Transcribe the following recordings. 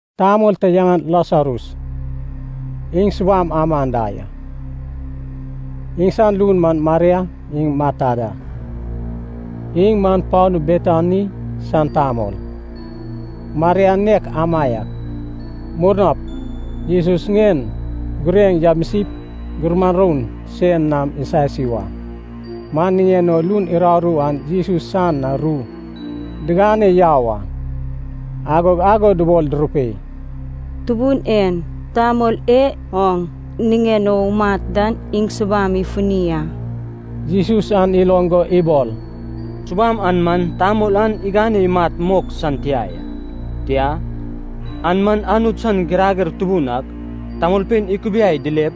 Tamol ta yaŋan Lasarus, iŋ subam aman da ya. Iŋsan lun man Maria iŋ Marta da, iŋ man panu Betani san tamol. Maria nek amaiak murnap Jesus ŋien gureŋ yamisip, gumuran roun sen nam isasi wa. Man niŋen o lun uraru an Jesus san na ru digane yau a. Agog ago dubol durupei, “Tubun en, tamol e oŋ niŋen o umat den iŋ subam ifuni a.” Jesus an iloŋ go ibol, “Subam an man tamol an igane imat mok san tia ya. Tia, an man Anut san girager tubun ak tamolpein ikubiai dilep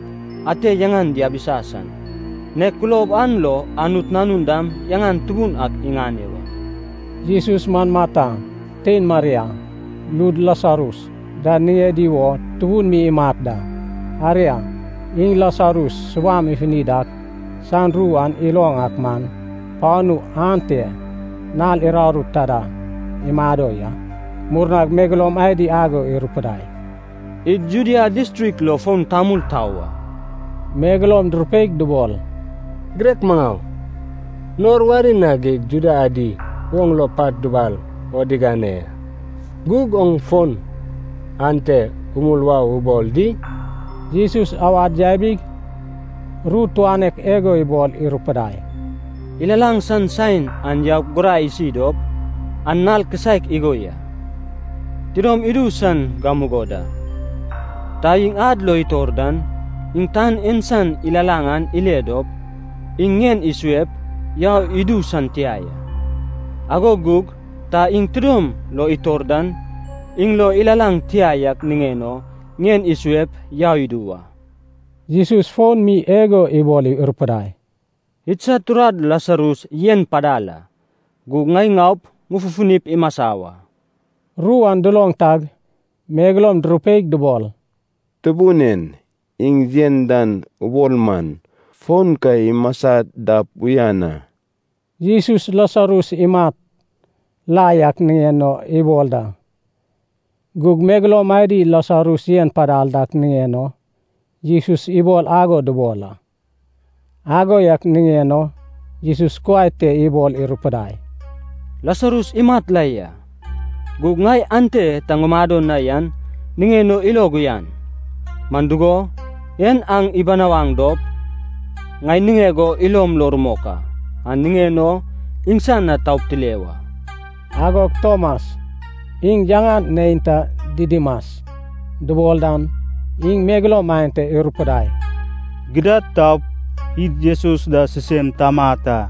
ate yaŋan diabisa san. Nek kulob an lo Anut Nanun dam yaŋan tubun ak iŋane wa.” Jesus man Marta, tein Maria, lud Lasarus da niŋedi wo tubun mi imat da. Aria, iŋ Lasarus subam ifuni dak san ru an iloŋ ak man, panu ante nal uraru taida imado ya. Murnag megeloum adi ago irupudai, “Id Judea distrik lo fon tamul tau a.” Megeloum durupeig dubol, “Girek maŋau, nor wari na geig Juda adi oŋ lo pat dubal o digane ya. Gug oŋ fon ante umul wau o ubol di?” Jesus awad yabig, ru tuanek igo ibol irupidai, “Ilalaŋ san saen an yaup gurai isi dop, an nal kisaek igo ya. Tidom idu san gamugo da. Ta iŋ ad lo itor dan, iŋ tan en san ilalaŋ an ile dop, iŋ ŋien isuep, yau idu san tia ya. Ago gug ta iŋ tidom lo itor dan, iŋ lo ilalaŋ tia yak niŋen o ŋien isuep, yau idu wa.” Jesus fon mi igo ibol irupudai, “Idsad turad Lasarus yen padal a. Gug ŋai ŋaup, ŋufufunip imasa wa.” Ru an duloŋ tag megeloum durupeig dubol, “Tubun en, iŋ yen dan ubol man, fon ka imasa dap uyan a.” Jesus Lasarus imat la yak niŋen o ibol da. Gug megeloum adi Lasarus yen padal dak niŋen o Jesus ibol ago dubol a. Ago yak niŋen o Jesus kuai te ibol irupudai, “Lasarus imat la ya. Gug ŋai ante ta ŋumado na yan niŋen o ilog uyan. Man dugo, en aŋ ibinawaŋ dop ŋai niŋeg o ilom lo rumok a. An niŋen o iŋsan na taup tile wa.” Agog Tomas, iŋ yaŋan neinta Didimas dubol dan, iŋ megeloum aenta irupudai, “Gidad taup, id Jesus da sisem tamat a.”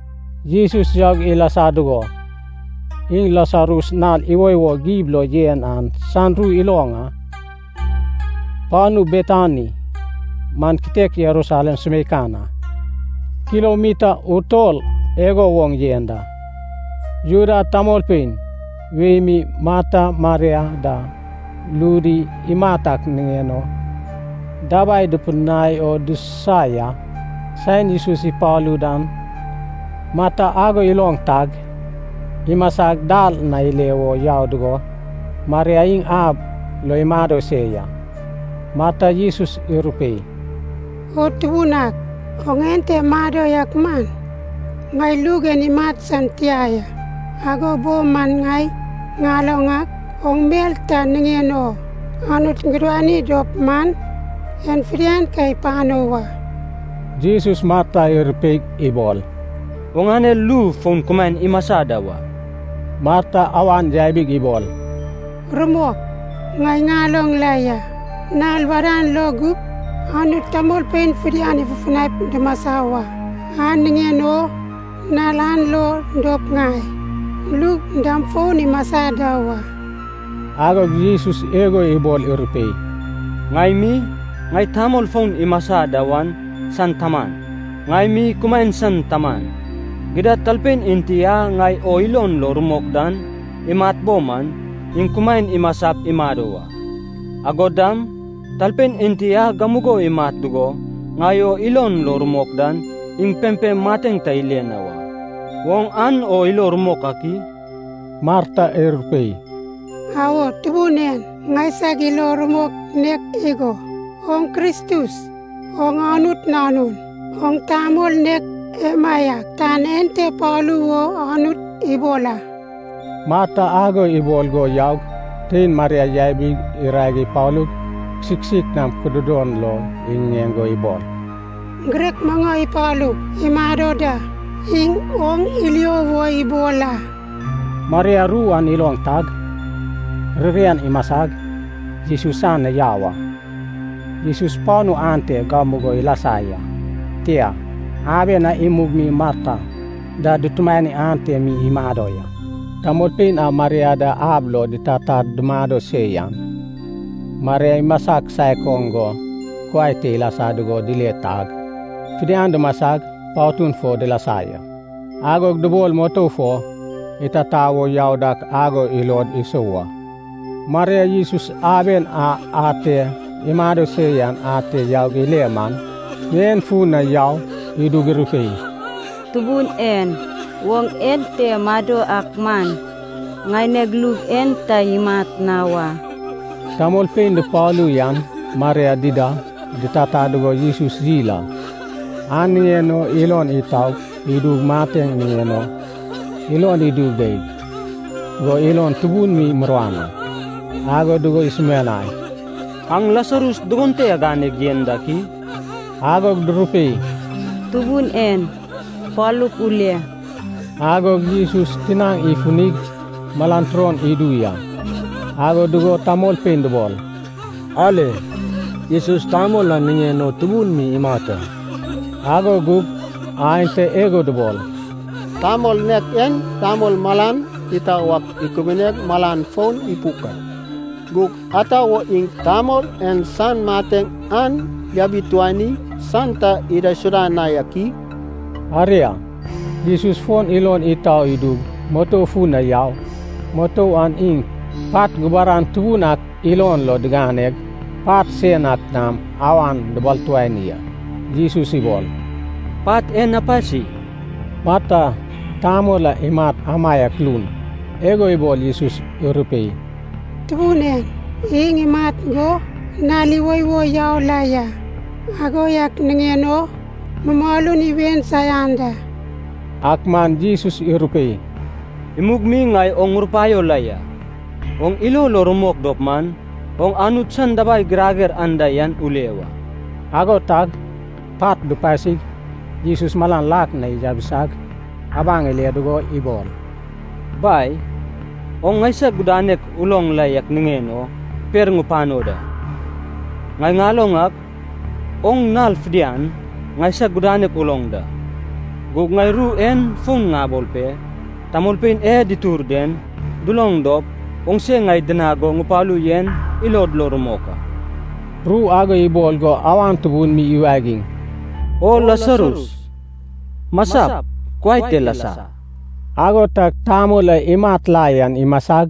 Jesus yaug ilasa dugo, iŋ Lasarus nal iwoiwo gib lo yen an san ru iloŋ a. Panu Betani man kitek Jerusalem sumeikan a, kilomita utol igo woŋ yen da. Juda tamolpein wei mi Marta Maria da ludi imat ak niŋen o dabai dupidinai o dususa ya. Saen Jesus ipalu dan Marta ago iloŋ tag, imasag dal na ile wo yau dugo, Maria iŋ ab lo imado se ya. Marta Jesus irupei, “O Tubun ak, oŋ ente mado yak man, ŋaineg lug en imat san tia ya. Ago bo man ŋai ŋaloŋ ak, oŋ mel ta niŋen o Anut gudani dop man, en fidian ka ipano wa.” Jesus Marta irupeig ibol, “Oŋane lu fon kumaen imasa da wa.” Marta awan yabig ibol, “Rumok, ŋai ŋaloŋ la ya, nal wadan lo gup Anut tamolpein fidian ifufunaip dumasa wa. An niŋen o nal an lo dop ŋai lug dam fon imasa da wa.” Agog Jesus igo ibol irupei, “Ŋai mi, ŋai tamol fon imasa da wan san taman, ŋai mi kumaen san taman. Gidad talpein enti a ŋai o ilon lo rumok dan imat bo man, iŋ kumaen imasap imado wa. Agod dam, talpein enti a gamugo imat dugo ŋai o ilon lo rumok dan, iŋ pempem mateŋ ta ile na wa. Oŋ an o ilo rumok ak i?” Marta irupei, “Awo, Tubun en. Ŋaisag ilo rumok nek igo, oŋ Kristus, oŋ Anut Nanun. Oŋ tamol nek emaiak tan ente palu wo Anut ibol a.” Marta ago ibol go yaug, tein Maria yabig irae ipalug, kisik kisik nam kududon lo iŋiŋeŋ go ibol, “Girek maŋau ipalug, imado da. Iŋ oŋ ilio wo ibol a.” Maria ru an iloŋ tag, ririan imasag, Jesus san na yau a. Jesus panu ante gamugo ilasa ya, tia, aben a imug mi Marta da dutumani ante mi imado ya. Tamolpein a Maria da ab lo ditatad dumado se yan, Maria imasa kisaek oŋ go kuai te ilasa dugo dile tag, fidian dumasag patun fo dilasa ya. Agog dubol mutou fo itata wo yau dak ago ilod isou a. Maria Jesus aben a ate imado se yan ate yaug ile man, ŋien fun na yau idug irupei, “Tubun en, oŋ ente mado yak man, ŋaineg lug en ta imat na wa.” Tamolpein dupalu yan Maria dida ditata dugo Jesus yil a. An niŋen o ilon itau idug mateŋ niŋen o ilon idu geig go ilon tubun mi muruan a. Ago dugo isumianai, “Aŋ Lasarus dugon te aganeg yen dak i?” Agog durupei, “Tubun en, palup ule.” Agog Jesus tinaŋ ifunig malan turon idu ya. Ago dugo tamolpein dubol, “Ale, Jesus tamol an niŋen o tubun mi imat a.” Ago gug aenta igo dubol, “Tamol nek en tamol malan itau ak ikubuneg malan fon ipuk a. Gug ata wo iŋ tamol en san mateŋ an yabituani san ta idaisuda na yak i?” Aria, Jesus fon ilon itau idug mutou fun na yau. Mutou an iŋ pat gubaran tubun ak ilon lo diganeg, pat sen ak nam awan dibaltuani a. Jesus ibol, “Pat en apasi.” Marta, tamol a imat amaiak lun, igo ibol Jesus irupei, “Tubun en, iŋ imat go nal iwoiwo yau la ya. Ago yak niŋen o mumalun iwen saian da.” Ak man Jesus irupei, “Imug mi ŋai oŋ ŋurupaio la ya, oŋ ilo lo rumok dop man, oŋ Anut san dabai girager anda yan ule wa.” Ago tag pat dupasig Jesus malan lak na yabisag, abaŋ ile dugo ibol, “Bai, oŋ ŋaisag gudanek uloŋ la yak niŋen o per ŋupano da. Ŋai ŋaloŋ ak, oŋ nal fidian ŋaisag gudanek uloŋ da. Gug ŋai ru en fon ŋabol pe, tamolpein e ditur den duloŋ dop, oŋse ŋai dinag go ŋupalu yen ilod lo rumok a.” Ru ago ibol go awan tubun mi iwagiŋ, “O Lasarus, masap, kuai te lasa!” Ago tag tamol a imat la yan imasag,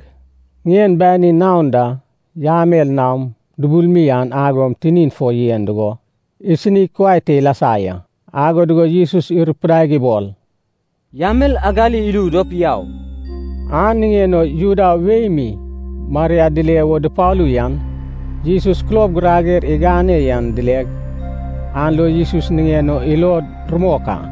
ŋien banin naon da yamel nam dubuluwi an ago tinin fo yen dugo, isinig kuai te ilasa ya. Ago dugo Jesus irupidaig ibol, “Yamel agali idu dop yau.” An niŋen o Juda wei mi Maria dile wo dupalu yan, Jesus kulob girager igane yan dileg, an lo Jesus niŋen o ilod rumok a.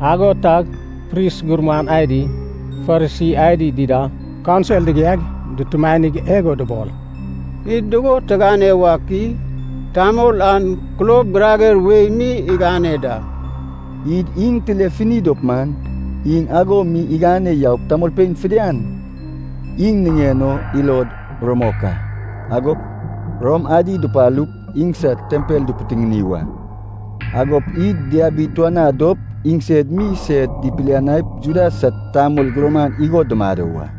Ago tag pris gurman adi, Farisi adi dida kaunsil digiaig dutumanig igo dubol, “Id dugo tigane wak i? Tamol an kulob girager wei mi igane da. Id iŋ tilefuni dop man, iŋ ago mi igane yaup tamolpein fidian iŋ niŋen o ilod rumok a. Agop Rom adi dupalup, idsad tempel dipitiŋini wa. Agop id diabituanad dop iŋsed mi sed ipilianaip Juda sad tamol gurman igo dumado wa.”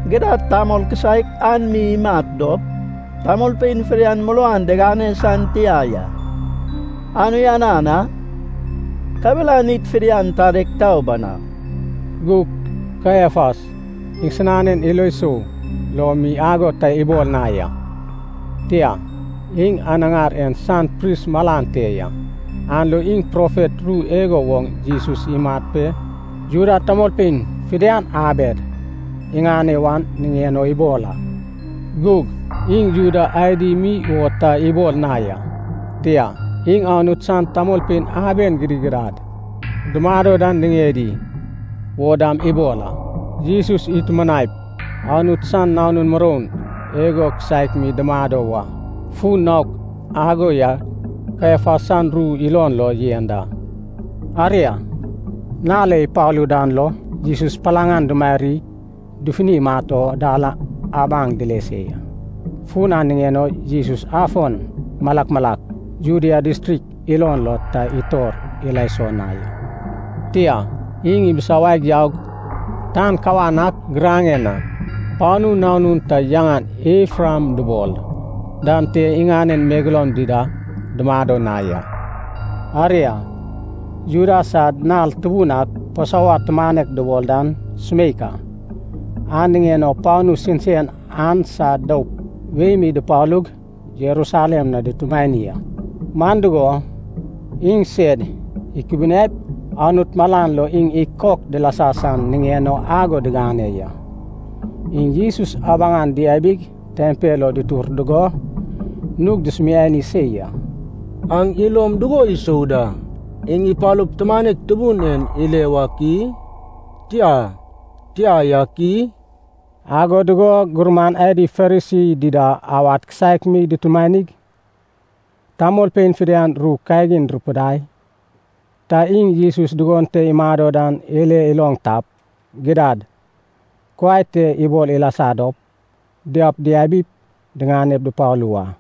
Gidad, tamol kisaek an mi imat dop, tamolpein fidian muruan diŋane san tia ya, an uyanan a. Kabelan id fidian tadeg tau banau.” Gug Kaiafas iŋsinanen ilo sou lo mi ago ta ibol na ya. Tia, iŋ anaŋar en san pris malan te ya, an lo iŋ profet ru igo woŋ Jesus imat pe Juda tamolpein fidian abed iŋane wan niŋen o ibol a. Gug iŋ Juda adi mi wo ta ibol na ya, tia, iŋ Anut san tamolpein aben gidigidad dumado dan niŋedi wo dam ibol a. Jesus itumanaip Anut san nanun muroun igo kisaek mi dumado wa, fun naok ago yan Kaiafas san ru ilon lo yen da. Aria, nal a ipalu dan lo, Jesus palaŋ an dumarig dufunip imat o dal abaŋ dile se ya. Fun an niŋen o Jesus afon malak malak Judea distrik ilon lo ta itor ila iso na ya. Tia, iŋ ibisawaig yaug, tan kawan ak giraŋen na panu nanun ta yaŋan Efraim dubol dan te iŋanen megeloum dida dumado na ya. Aria, Juda sad nal tubun ak Pasova tumanek dubol dan sumeik a. An niŋen o panu sensen an san doup wei mi dupalug Jerusalem na dutumani a. Man dugo, iŋsed ikubuniaip Anut malan lo iŋ ikok dilasa san niŋen o ago digane ya. Iŋ Jesus abaŋan diabig tempel lo dutur dugo, nug dusumiani se ya, “Aŋ ilom dugo isou da, iŋ ipalup, tumanek tubun en ile wak i? Tia, tia yak i?” Ago dugo gurman adi Farisi dida awad kisaek mi dutumanig, tamolpein fidian ru kagin durupidai. Ta iŋ Jesus dugon te imado dan ile iloŋ tap, gidad, kuai te ibol ilasa dop, diaup diabip, diŋane dupalu wa.